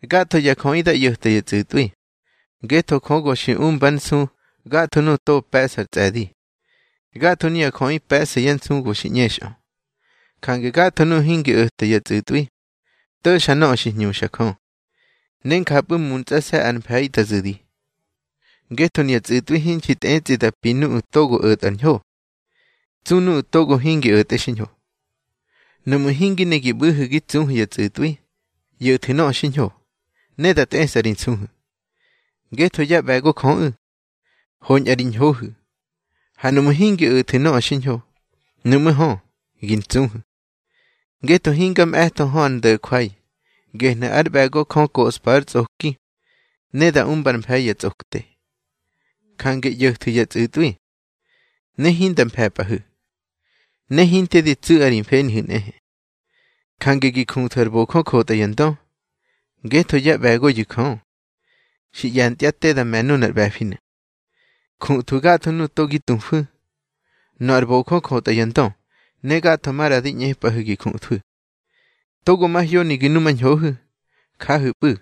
Gatho ya jöꞌi dá ꞌyo̱ta ya tsꞌu̱tꞌwi, ngetho Jö go xi umbár nsu gatho nuꞌu̱ togo pe̱ꞌsar tsꞌe̱di. Gatho nuya jöꞌi pe̱ꞌsa yá nsu go xi ꞌñexꞌö. Jange gatho nuꞌu̱ hingi o̱ta ya tsꞌu̱tꞌwi, to̱xa nöꞌö xi hñuxa Jö, ne njapꞌu̱ muntsꞌase̱ ár mfe̱i da zu̱di. Ngetho nuya tsꞌu̱tꞌwi hinxi tꞌetsꞌi da pi nuꞌu̱ togo o̱tꞌa ar ñho, tsu nuꞌu̱ togo hingi o̱tꞌe xiñho. Nuꞌmu̱ hingi ne gi ꞌbu̱hu̱ gi tsuhu̱ ya tsꞌu̱tꞌwi, ꞌyo̱thu̱ nöꞌö xiñho, ne da tꞌesꞌa ri nsuhu̱. Ngetho yá ꞌbe̱go Jöꞌu̱, hoñꞌa ri ñhohu̱. Ha nuꞌmu̱ hingi o̱thu̱ nöꞌö xiñho, nuꞌmú̱ hö, gi ntsuhu̱. Ngetho hinga mꞌe̱tho hö ár ndo̱jwai, gehnu̱ ár ꞌbe̱go Jö da koꞌspa yá tsꞌoki ne da umbár mfe̱i ya tsꞌokte. Jange ꞌyo̱thu̱ ya tsꞌu̱tꞌwi, ne hinda mfe̱pꞌahu̱, ne hinte di tsu̱ꞌa ri mfenihu̱ nꞌehe. Jange gi juthu̱ ar bojö jotꞌa ya ndö, ngetho yá ꞌbe̱goyu̱ Jö, xi ꞌye̱ntyá te da me̱ nunar ꞌbe̱finu̱. Juthwu̱ gatho nuꞌu̱ togo gi tufu̱: nöꞌö ar bojö jotꞌa ya ndö, ne gatho maꞌra di ꞌñepꞌahu̱ gi juthwu̱. Togo mahyoni gi numañhohu̱, jahu̱pꞌu̱,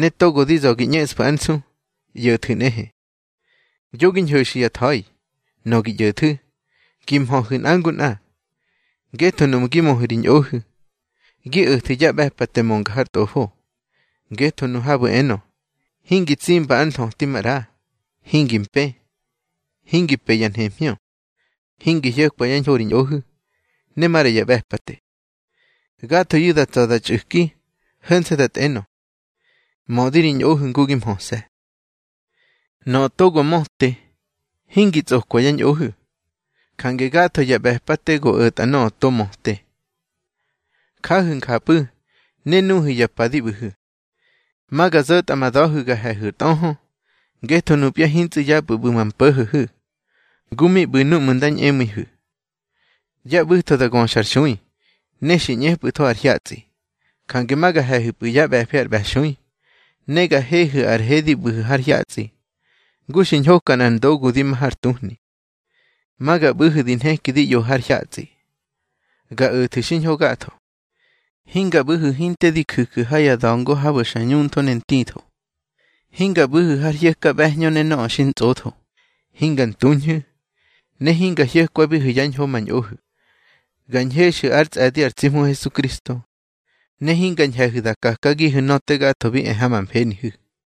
ne togo di za̱ gi ꞌñeꞌsfu̱ ár nsu, ꞌyo̱thu̱ nꞌehe. Yo gi ñho̱xu̱ ya tha̱i. Nöꞌö gi ꞌyo̱thu̱, gi mhöhu̱ nꞌa ngu nꞌa. Ngetho nuꞌmu̱ gi möhu̱ ri ñꞌohu̱, gi o̱thu̱ ya ꞌbe̱pate mönga har Tꞌofo. Ngetho nu habu̱ enö: Hingi tsimba ár nthöti maꞌra, hingi mpë, hingi pe ya nhemhñö, hingi hyo̱kwa yá ñho ri ñꞌohu̱, ne maꞌra ya ꞌbe̱pate; gathoyu̱ da tsa̱ da txꞌu̱ki ho̱nse̱ da tꞌenö: Mö ri ñꞌohu̱ ngu gi mhöse̱. Nöꞌö togo möte, hingi tsꞌokwa yá ñꞌohu̱. Jange gatho ya ꞌbe̱pate go o̱tꞌa nöꞌö to möte. Jahu̱ njapꞌu̱, ne nuhu̱ ya pa di ꞌbu̱hu̱. Ma ga zo̱tꞌa ma da̱hu̱ ga he̱hu̱ ar tꞌöhö. Ngetho nupya hintsꞌu̱ yapꞌu̱ ꞌbu̱ ma mpo̱ho̱hu̱, ngu mi ꞌbu̱ núꞌmu̱ nda ñꞌemu̱ihu̱. Ya ꞌbu̱tho da göxar xui, ne xi ꞌñepꞌu̱tho ar hyatsꞌi. Jange ma ga he̱hu̱pꞌu̱ yá ꞌbe̱fi ar ꞌbe̱xui, ne ga hehu̱ ar he di bꞌu̱hu̱ har hyatsꞌi, ngu xi ñhoka nꞌar ndogu di ma har tuhni. Ma ga ꞌbu̱hu̱ di nheki di ꞌyohu̱ har hyatsꞌi, ga o̱thu̱ xiñho gatho. Hinga ꞌbu̱hu̱ hinte di ju̱ju̱ ha ya da̱ngo habu̱ xa ñuntho ne ntitho. Hinga ꞌbu̱hu̱ har hyo̱ka ꞌbe̱hñö ne nöꞌö xi ntsꞌotho. Hinga ntuñhu̱, ne hinga hyo̱kwabihu̱ yá ñho ma ñꞌohu̱. Ga ñhexu̱ ár tsꞌe̱di ar tsi Hmu Hesukristo, ne hinga ñhe̱hu̱ da kakagihu̱ nöꞌö te gatho bi e ha ma mfenihu̱.